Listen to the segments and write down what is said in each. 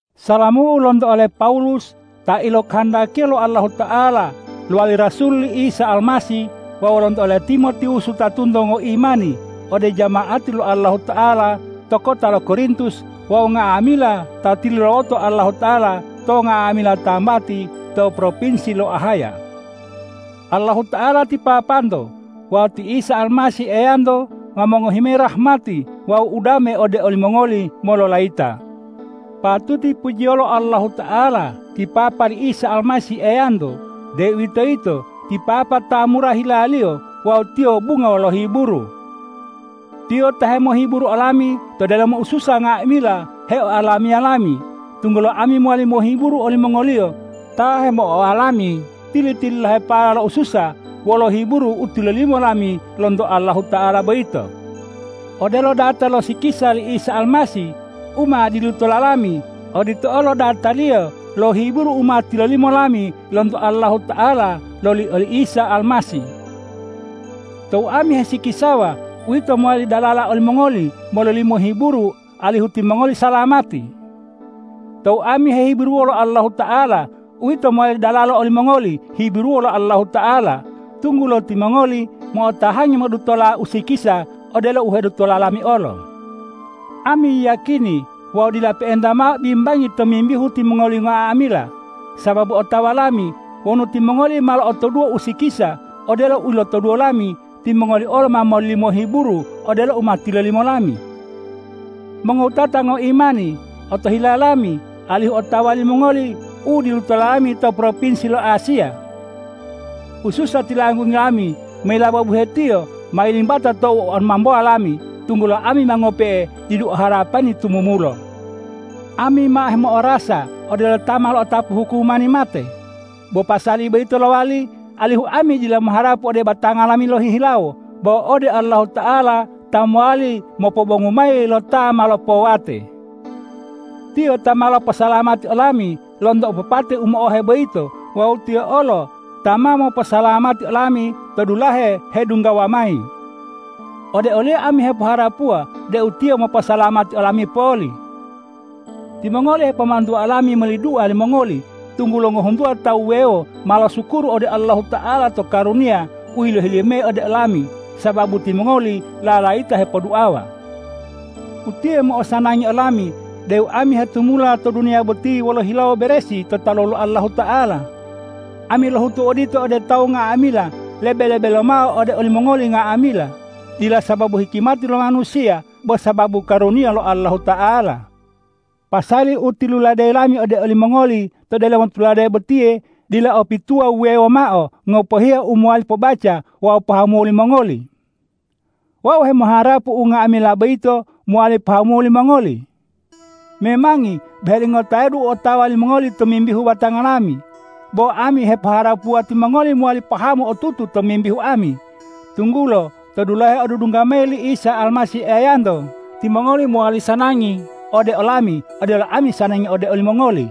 Salamu lonto ole Pawulus ta ilokohondakiya lo Allahuta'ala lowali rasul li Isa Almasih wawu lonto ole Timotiwus wutatonto ngoimani ode jama'ati lo Allahuta'ala to kota lo Korintus wawu nga'amila ta tilulawoto Allahuta'ala to nga'amila tambati to propinsi lo Ahaya. Allahuta'ala ti Papanto wawu ti Isa Almasih Eyanto ma mongohi mayi rahmati wawu udame ode olimongoli mololayita. Patuti pujiyolo Allahuta'ala ti Papa li Isa Almasih Eyanto, deuwitoyito ti Papa ta mura hila-Liyo wawu Tiyo bungo lo hiburu. Tiyo ta hemohiburu olami to delomo ususa nga'amila heoalamiya lami, tunggulo ami mowali mohiburu olimongoliyo ta hemo'oalami tili-tililahepala lo ususa wolo hiburu u tilolimo lami lonto Allahuta'ala boyito. Odelo data lo sikisa li Isa Almasih u ma dilutola lami, odito olo dataliyo lo hiburu u ma tilolimo lami lonto Allahuta'ala loli oli Isa Almasih. Tou ami hesikisawa, uwito mowali dalalo olimongoli mololimo hiburu alihu timongoli salamati. Tou ami hehiburuwo lo Allahuta'ala, uwito mowali dalalo olimongoli hiburuwo lo Allahuta'ala, tunggulo timongoli mo'otahangi modutola usikisa odelo u hedutola lami olo. Ami yiyakini wawu dila pe'enta mao bimbangi tomimbihu timongoli nga'amila, sababu otawa lami wonu timongoli ma lo'otoduwo usikisa odelo u lotoduwo lami, timongoli olo ma mololimo hiburu odelo u ma tilolimo lami. Mongowutata ngoimani, otohila lami alihu otawa limongoli u dilutola lami to propinsi lo Asiya. Ususa tilanggungi lami mayilaba buhetiyo ma yilimbata tou omambowa lami, tunggulo ami ma ngope'e didu o harapani tumumulo. Ami ma hemo'orasa odelo ta ma lo'otapu hukumani mate. Bo pasali boyito lowali, alihu ami dila moharapu ode batanga lami lohihilawo, bo ode Allahuta'ala ta mowali mopobongu mayi lo ta ma lopowate. Tiyo ta ma loposalamati olami lonto opopate u mo'ohe boyito wawu Tiyo olo ta ma moposalamati olami to dulahe hedunggawa mayi. Ode o-Liyo ami hepoharapuwa deu Tiyo moposalamati olami poli. Timongoli hepomantuwa olami moli dua limongoli, tunggulo ngohuntuwa tawu wuwewo ma mosukuru ode Allahuta'ala to karuniya u yilohi-Liyo ode olami, sababu timongoli lalayita hepoduawa. Utiye u mo'osanangi olami deu ami hetumula to duniya boti wolo hilawo beresi to talu lo Allahuta'ala. Ami lohutu odito ode tawu nga'amila lebe-lebe lomao ode olimongoli nga'amila, dila sababu hikimati lo manusiya, bo sababu karuniya lo Allahuta'ala. Pasali u tiluladeyi lami ode olimongoli to delomo tulade botiye dila o pituwa wuwewo mao ngopohiya u mowali pobaca wawu pahamuwo limongoli. Wau hemoharapu unga'amila boyito mowali pahamuwo limongoli. Memangi boheli ngotayadu u otawa limongoli tomimbihu batanga lami, bo ami hepoharapuwa timongoli mowali pahamu otutu tomimbihu ami, tunggulo to dulahe odudungga mayi li Isa Almasih Eyanto, timongoli mowali sanangi ode olami odelo ami sanangi ode olimongoli.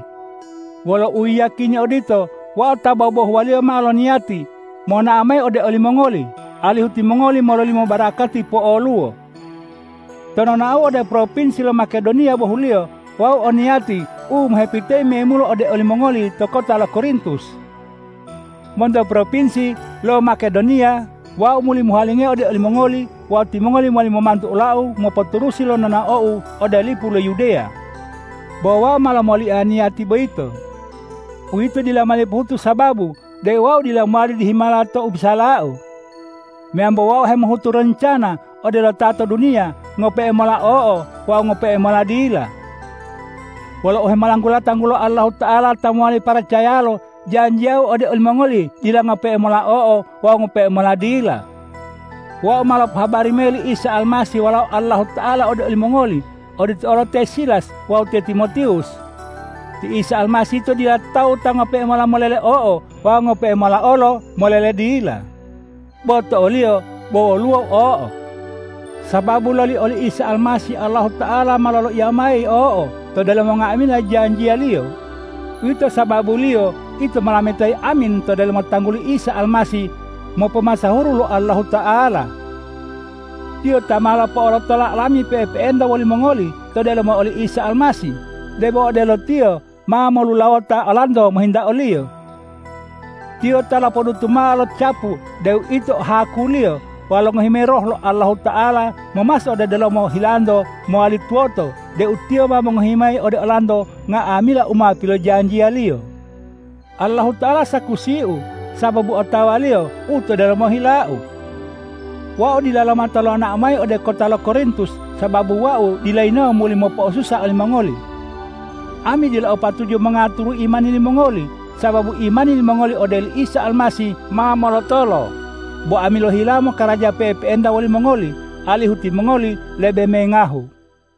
Wolo uyiyakini odito, wau tou bobohuwaliyo mao loniyati monao mayi ode olimongoli, alihu timongoli mololimo barakati po'oluwo. To nonaou ode propinsi lo Makedoniya bohuliyo wau o niyatiu mohepitayi memulo ode olimongoli to kota lo Korintus. Monto propinsi lo Makedoniya wau muli mohuwalingayi ode olimongoli wawu timongoli mowali momantu olau mopoturusi lo nonaou ode lipu lo Yudeya. Bo wau ma lomolia niyati boyito. Uwito dila mowali pohutu sababu deu wau dila mowali dihimala to u hebisalau. Meyambo wau hemohutu roncana odelo ta to duniya, ngope'e mola o'o wawu ngope'e mola dila. Wolo uhemolanggula tanggulo Allahuta'ala ta mowali paracayalo, janjiyau ode olimongoli dila ngope'e mola o'o wawu ngope'e mola dila. Wau ma lopohabari mayi li Isa Almasih Walao Allahuta'ala ode olimongoli, odito olo te Silas wawu te Timotiwus. Ti Isa Almasih yito dila tawu ta ngope'e mola molele o'o wawu ngope'e mola olo molele dila. Bo to o-Liyo bo woluwo o'o, sababu loli oli Isa Almasih Allahuta'ala ma loloiya mayi o'o to delomo nga'amila janjiya-Liyo. Uwito sababuliyo ito molametayi amin to delomo tangguli Isa Almasih mopomasahuru lo Allahuta'ala. Tiyo ta ma lopo'olotola olami pe'epe'enta wolimongoli to delomo oli Isa Almasih, debo odelo Tiyo ma lolulawota olanto mohinta o-Liyo. Tiyo ta lopodutu mao lo capu deu ito haku-Liyo wawu longohi mayi Roh lo Allahuta'ala momaso ode delomo hilanto mowali tuwoto deu Tiyo ma mongohi mayi ode olanto nga'amila u ma pilojanjiya-Liyo. Allahuta'ala sakusiu sababu otawa-Liyo u to delomo hilau. Wau dila lomata lonao mayi ode kota lo Korintus, sababu wau dila yinawo muli mopo'osusa olimongoli. Ami dila o patuju mongaturu imani limongoli, sababu imani limongoli ode oli Isa Almasih ma molotolo. Bo ami ohilawo mokaraja pe'epe'enta wolimongoli, alihu timongoli lebe mengahu.